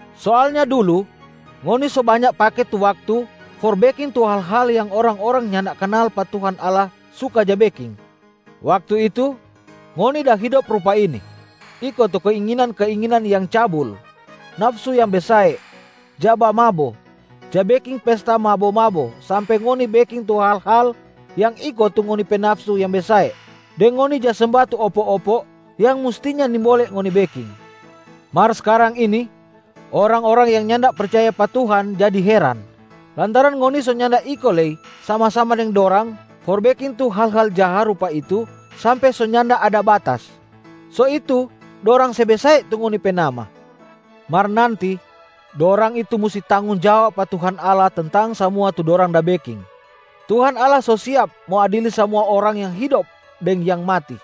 Soalnya dulu, ngoni so banya pake tu waktu for beking tu hal-hal yang orang-orang nyanda kanal pa Tuhan Allah suka ja beking. Waktu itu, ngoni da hidop rupa ini: iko tu keinginan-keinginan yang cabul, nafsu yang besae, ja bamabo, ja beking pesta mabo-mabo sampe ngoni beking tu hal-hal yang iko tu ngoni pe nafsu yang besae, deng ngoni ja semba tu opo-opo yang mustinya nimbole ngoni beking. Mar skarang ini orang-orang yang nyanda percaya pa Tuhan jadi heran, lantaran ngoni so nyanda iko lei sama-sama deng dorang for beking tu hal-hal jaha rupa itu sampe so nyanda ada batas, so itu dorang se besae tu ngoni pe nama. Mar nanti, dorang itu musti tanggong jawab pa Tuhan Allah tentang samua tu dorang da beking. Tuhan Allah so siap mo adili samua orang yang hidop deng yang mati.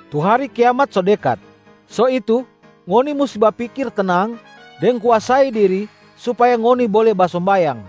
Tu hari kiamat so dekat. So itu, ngoni musti bapikir tenang deng kuasai diri supaya ngoni bole basombayang.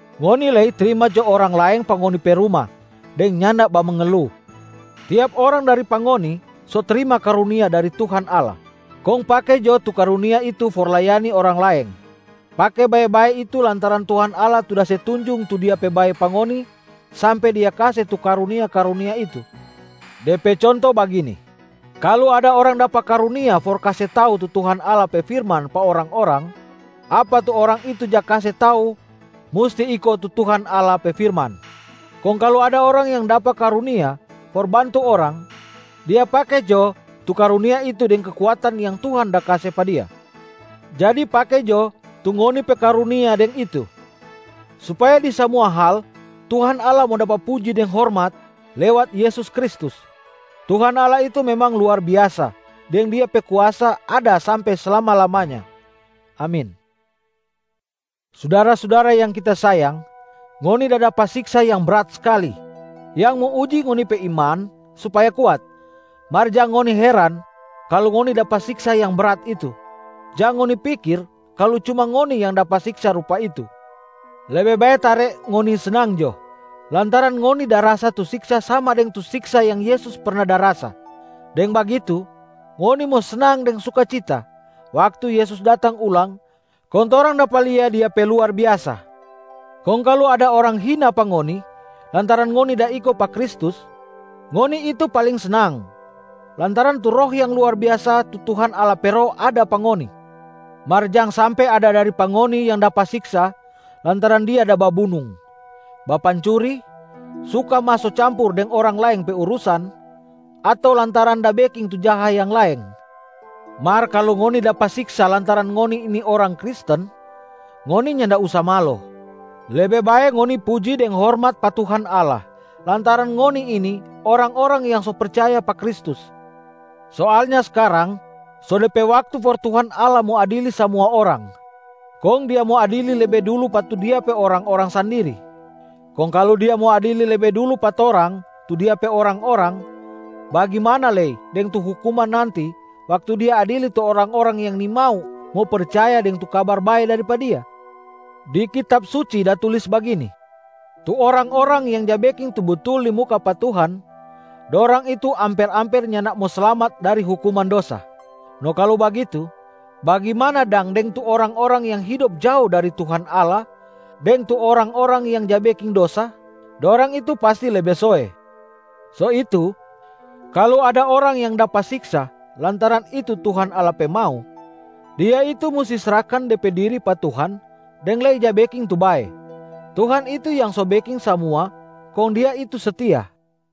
Ngoni lei trima jo orang laeng pa ngoni pe ruma deng nyanda bamengelu. Tiap orang dari pa ngoni so trima karunia dari Tuhan Allah, kong pake jo tu karunia itu for layani orang laeng, pake bae-bae itu lantaran Tuhan Allah tu da se tunjung tu Dia pe bae pa ngoni sampe Dia kase tu karunia-karunia itu. De pe conto bagini: kalu ada orang dapa karunia for kase tau tu Tuhan Allah pe firman pa orang-orang, apa tu orang itu ja kase tau musti iko tu Tuhan Allah pe firman. Kong kalu ada orang yang dapa karunia for bantu orang, dia pake jo tu karunia itu deng kekuatan yang Tuhan da kase pa dia. Jadi pake jo tu ngoni pe karunia bagitu, supaya di samua hal Tuhan Allah mo dapa puji deng hormat lewat Yesus Kristus. Tuhan Allah itu memang luar biasa deng Dia pe kuasa ada sampe slama-lamanya. Amin. Sudara-sudara yang kita sayang, ngoni da dapa siksa yang brat skali yang mo uji ngoni pe iman supaya kuat. Mar jang ngoni heran kalu ngoni dapa siksa yang brat itu, jang ngoni pikir kalu cuma ngoni yang dapa siksa rupa itu. Lebe bae tare ngoni snang jo lantaran ngoni da rasa tu siksa sama deng tu siksa yang Yesus perna da rasa. Deng bagitu, ngoni mo snang deng sukacita waktu Yesus datang ulang kong torang dapa lia Dia pe luar biasa. Kong kalu ada orang hina pa ngoni lantaran ngoni da iko pa Kristus, ngoni itu paling snang lantaran tu Roh yang luar biasa tu Tuhan Allah pe Roh ada pa ngoni. Mar jang sampe ada dari pa ngoni yang dapa siksa lantaran dia da babunung, bapancuri, suka maso campur deng orang laeng pe urusan, ato lantaran da beking tu jaha yang laeng. Mar kalu ngoni dapa siksa lantaran ngoni ini orang Kristen, ngoni nyanda usa malo. Lebe bae ngoni puji deng hormat pa Tuhan Allah lantaran ngoni ini orang-orang yang so percaya pa Kristus. Soalnya skarang so de pe waktu for Tuhan Allah mo adili samua orang, kong Dia mo adili lebe dulu pa tu Dia pe orang-orang sandiri. Kong kalu Dia mo adili lebe dulu pa torang tu Dia pe orang-orang, bagimana lei deng tu hukuman nanti waktu Dia adili tu orang-orang yang nimau mo percaya deng tu Kabar Bae dari pa Dia? Di Kitab Suci da tulis bagini, “Tu orang-orang yang ja beking tu butul di muka pa Tuhan, dorang itu amper-amper nyanda mo slamat dari hukuman dosa. No kalu bagitu, bagimana dang deng tu orang-orang yang hidop jao dari Tuhan Allah deng tu orang-orang yang ja beking dosa? Dorang itu pasti lebe soe!” So itu, kalu ada orang yang dapa siksa lantaran itu Tuhan Allah pe mau, dia itu musti srahkan de pe diri pa Tuhan deng lei ja beking tu bae. Tuhan itu yang so beking samua kong Dia itu setia.